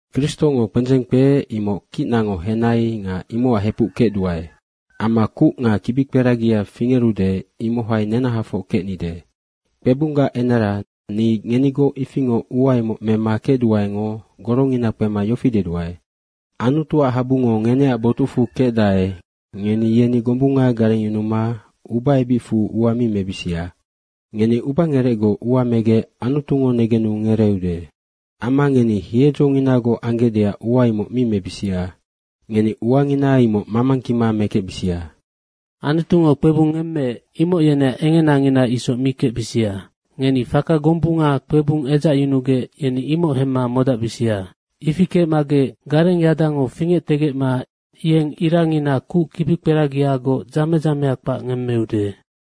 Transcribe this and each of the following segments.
Kristongo kpendzeng kpeec imoc kicnango henai nga imocac hepuc kecduae. Amma kuc nga kibikperagia fingerude, imohai nenahafoc kecnide. Kpebunggac enara ni ngenigoc ifingoc ua imoc mema kecduaengo gorongina kpema yofi deduae, Anutuac habungo ngeneac botucfu kecdae, ngeni yeni gombunga garengyunuma ubaebicfu ua mi mebisia, ngeni ubangerecgoc ua megec Anutungo negenu ngereeude. Amma ngeni hiedzonginagoc anggecdeac ua imoc mi mebisia. Ngeni uangina imoc mamangkima mekecbisia. Anutungo kpebung ngemmeec, imoc yeneac engenangina isoc mi kecbisia. Ngeni faka gombunga kpebung edzacyunugec, yeni imoc hemma modacbisia. Ifi kecmagec gareng yadango fingectegecma yeng irangina kuc kibikperagiagoc dzame dzamea kpac ngemmeude.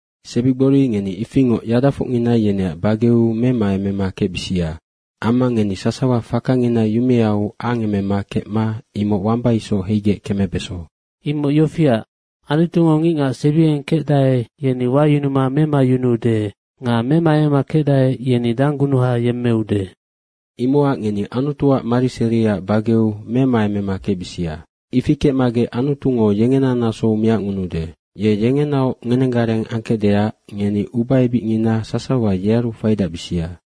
Sebigbori ngeni ifingoc yadafocngina yeneac bageu memaemema kecbisia. Amma ngeni sasawa fakangina yumeau angemema kecma imoc wamba isoc heigec kemebeso. Imoc yofiac, “Anutungo ngicngac sebiengeng kecdae, yeni wayunuma memayunuude nga memaemema kecdae, yeni danggunuha yemmeude.” Imocac ngeni Anutuac mariseriaac bageu memaemema kecbisia. Ifi kecmagec Anutungo yengena nasou miacngunuude. Ye yengenaoc ngenenggareng angkecdeac ngeni ubaebicngina sasawa yearu faidacbisia.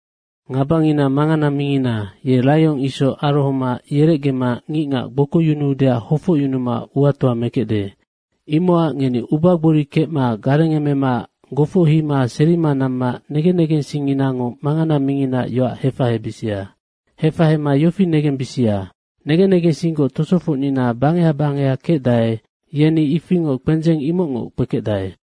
Ngabangina mangana mingina, ye raiong isoc arohoma yerecgema ngicngac gbokoyunuudeac hofocyunuma uatoa mekecde. Imocac ngeni ubagbori kecma garengemema gofochima serima namma negen negensingnginango mangana minginaac yoac hefahebisia. Hefahema yofi negembisia, negen negensinggoc tosofocngina bangeha bangeha kecdae, yeni ifingoc kpendzeng imocngoc kpekecdae.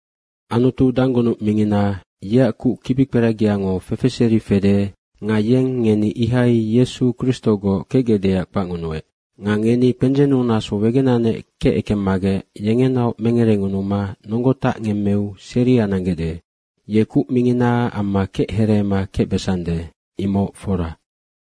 Anutu danggunuc mingina, yeac kuc kibikperagiango fefeseri fede nga yeng ngeni ihai Yesu Kristogoc kecgecdeac kpacngunuec. Nga ngeni kpendzennu naso wegenanec kecekemmagec, yengenaoc mengerengunuma nonggo tacngemmeu seria nanggecde. Ye kuc mingina amma kechereema kecbesande, imoc fora.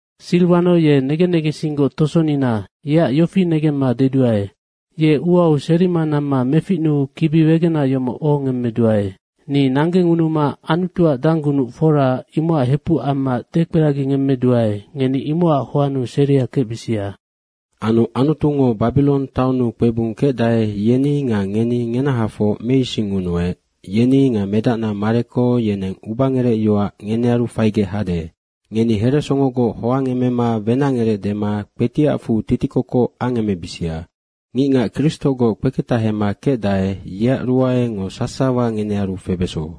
Siriwano ye negen negensinggoc tosonina yeac yofi negemma deduae, ye uau serima namma meficnuu kibi wegena yomoc ohongemmeduae. Ni nanggengunuma Anutuac danggunuc fora imocac hepuc amma dekperagingemmeduae, ngeni imocac hoannu seria kecbisia. Anu Anutungo Babirong taonnu kpebung kecdae, yeni nga ngeni ngenahafoc meisingngunuec, yeni nga medacna Mareko, yeneng ubangerecyoac ngenearu faigec hade. Ngeni heresongogoc hoangemema wenacngerec dema kpetiacfu titikokoc angemebisia. Ngicngac Kristogoc kpeketahema kecdae, yeac ruaengo sasawa ngenearu febeso.